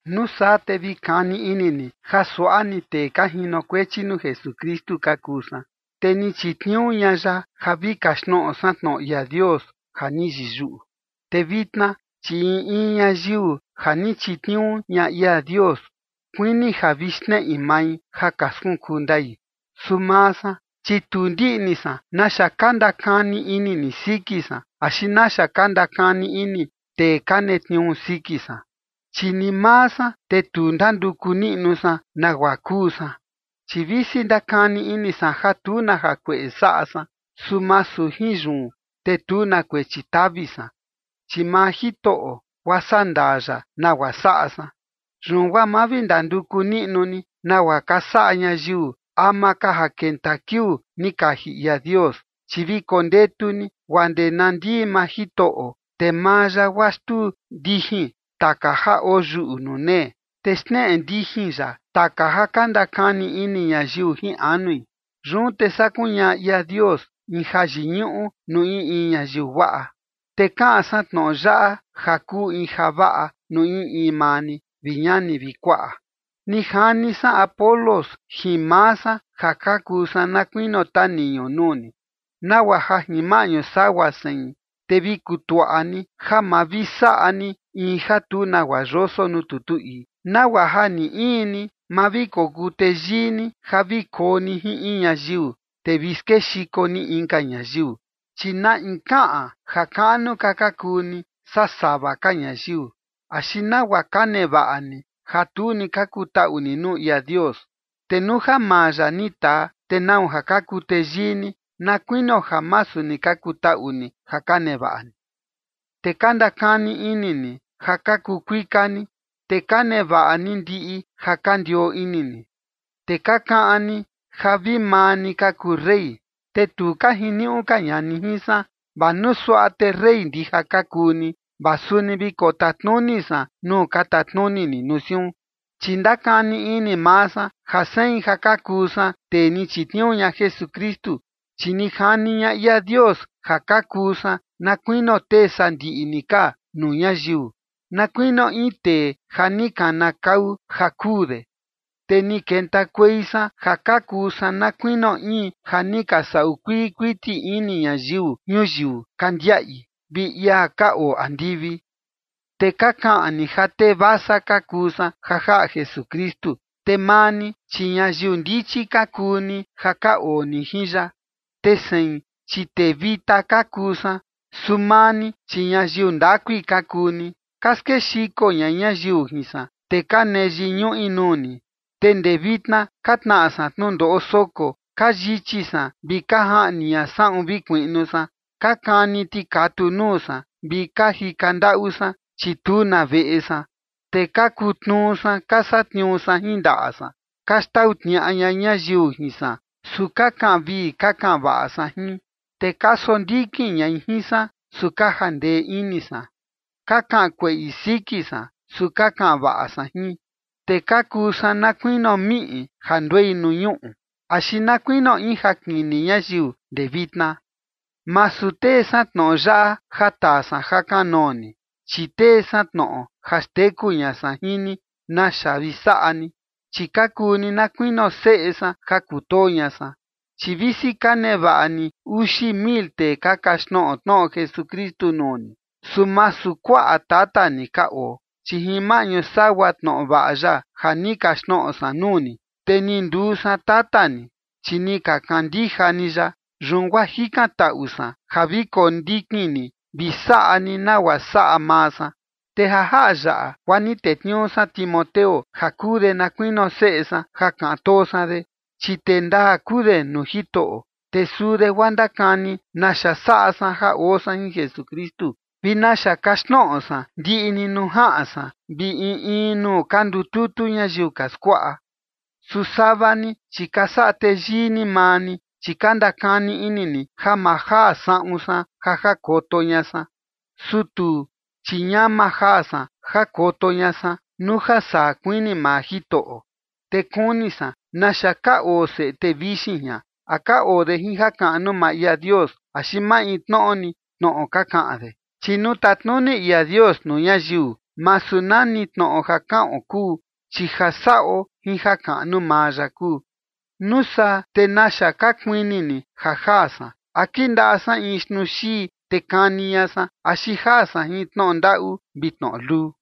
Nuu saa te vi kani ini ni ja suaꞌa ni tee ka jinokuechi nuu Jesukristu ka kuu san, te ni chitniuu ña ya ja vi kaxtnoꞌo san tnoꞌo ia Dios ja ni yiyuꞌu. Te vitna, chi in in ñayiu ja ni chitniuu ña ia Dios, kuini ja vi xneꞌi mai ja ka skunkuu ndai. Su maa san, chi tu ndiꞌni san naxa ka ndakani ini ni siki san, axi naxa ka ndakani ini tee ka netniuu siki san. Chi ni maa san, te tu ndanduku niꞌnu san nagua kuu san. Chi visi ndakani ini san ja tu na jakueꞌe saꞌa san, su masu jin yun, te tu na kuechi tavi san, chi maa Jitoꞌo guaa sandaa ya nagua saꞌa san. Yun guaa ma vi ndanduku niꞌnu ni nagua ka saꞌa ñayiu ama ka ja kenta kiuu ni kaji ia Dios, chi vi kondetu ni guaa ndee na ndii maa Jitoꞌo, te maa ya guaa xtuu ndijin taka ja oyuꞌu nuu nee, te xneꞌe ndijin ya taka ja ka ndakani ini ñayiu jin anui. Yun te saa kuñaꞌa ia Dios in jayiñuꞌu nuu in in ñayiu guaꞌa. Te kaꞌan san tnoꞌo yaꞌa ja kuu in javaꞌa nuu in in maa ni, vi ñani vi kuaꞌa. Ni jani san Apolos jin maa san ja ka kuu san na kuinio taniñu nuu ni, nagua ja jin maꞌñu sagua sein, te vi kutuaꞌa ni ja ma vi saꞌa ni in ja tu nagua yoso nuu tutu ii, nagua ja ni in ni, ma vi kokuu teyii ni ja vi koo ni jin in ñayiu, te vi skexiko ni inka ñayiu. ¿Chi na in kaꞌan ja kaꞌnu ka ka kuu ni saa sava ka ñayiu? ¿Axi nagua ka nevaꞌa ni ja tu ni ka kutaꞌu ni nuu ia Dios? Te nuu ja maa ya ni taa, ¿te nau ja ka kuu teyii ni na kuinio ja masu ni ka kutaꞌu ni ja ka nevaꞌa ni? Te ka ndakani ini ni ja ka kuu kuika ni, te ka nevaꞌa ni ndiꞌi ja ka ndioo ini ni, te ka kaꞌan ni ja vi maa ni ka kuu rey, te tu ka jiniuꞌu ka ña ni jin san. Vaa nuu suaꞌa te rey ndija ka kuu ni, vaa suni vi kotatnuni san nuu ka tatnuni ni nuu siun. Chi ndakani ini maa san ja sein ja ka kuu san tee ni chitniuu ña Jesukristu, chi ni jani ña ia Dios ja ka kuu san na kuinio tee sandiꞌi ni ka nuu ñayiu, na kuinio in tee ja ni kanakau ja kuu de. Te ni kentakuei san ja ka kuu san na kuinio in ja ni ka saꞌu kuii kuiti ini ñayiu ñuyiu ka ndiaꞌi, vi ia ka oo andivi. Te ka kaꞌan ni ja tee vasa ka kuu san ja jaꞌa Jesukristu, te maa ni, chi ñayiu ndichi ka kuu ni ja ka oo ni jin ya. Te sein, chi tee vita ka kuu san, su maa ni, chi ñayiu ndakui ka kuu ni. Ka skexiko ña ñayiu jin san, te ka nee yiñuꞌi nuu ni. Te ndee vitna ka tnaꞌa san tnundoꞌo soko, ka yichi san vi ka jaꞌni ña saꞌun vi kuiꞌnu san, ka kani tikatu nuu san, vi ka jika ndaꞌu san, chi tu na veꞌe san. Te ka kutnuu san ka satniuu san jin ndaꞌa san. Ka xtau tniaꞌa ña ñayiu jin san, su ka kaꞌan vii ka kaꞌan vaꞌa san jin. Te ka sondikin ñai jin san, su ka jandee ini san. Ka kaꞌan kueꞌi siki san, su ka kaꞌan vaꞌa san jin. Te ka kuu san na kuinio miꞌi ja nduei nuu ñuꞌu, axi na kuinio in jakini ñayiu ndee vitna. Masu tee san tnoꞌo yaꞌa ja taa san ja kanoo ni, chi tee san tnoꞌo ja xteku ña san jin ni naxa vi saꞌa ni, chi ka kuu ni na kuinio seꞌe san ja kutoo ña san. Chi visi ka nevaꞌa ni uxi mil tee ka kaxtnoꞌo tnoꞌo Jesukristu nuu ni, su masu kuaꞌa tata ni ka oo. Chi jin maꞌñu sagua tnoꞌo vaꞌa ya ja ni kaxtnoꞌo san nuu ni, te ni nduu san tata ni, chi ni ka kandija ni ya. Yun guaa jikantaꞌu san ja vi kondikin ni vi saꞌa ni nagua saꞌa maa san. Te ja jaꞌa yaꞌa guaa ni tetniuu san Timoteo ja kuu de na kuinio seꞌe san ja kaꞌan too san de, chi tee ndaa kuu de nuu Jitoꞌo. Te suu de guaa ndakani naxa saꞌa san ja oo san jin Jesukristu, vi naxa kaxtnoꞌo san ndiꞌi ni nuu jaꞌan san vi in in nuu ka ndututu ñayiu ka skuaꞌa. Su sava ni, chi ka saꞌa teyii ni maa ni, chi ka ndakani ini ni ja ma jaa saꞌun san ja jakoto ña san. Su tuu, chi ñama jaa san jakoto ña san, nuu ja saa kuini maa Jitoꞌo. Te kuni san naxa ka oo seꞌe tee vixin jian, a ka oo de jin jakaꞌnu maa ia Dios axi maintnoꞌo ni tnoꞌo ka kaꞌan de. Chi nuu tatnuni ia Dios nuu ñayiu, masu nani tnoꞌo ja kaꞌon kuu, chi ja saꞌo jin jakaꞌnu maa ya kuu. ¿Nuu saa te naxa ka kuini ni ja jaa san? ¿A kindaꞌa san in xtnuu xii, te kani ña san, axi jaa san jin tnoꞌo ndaꞌu vi tnoꞌo luu?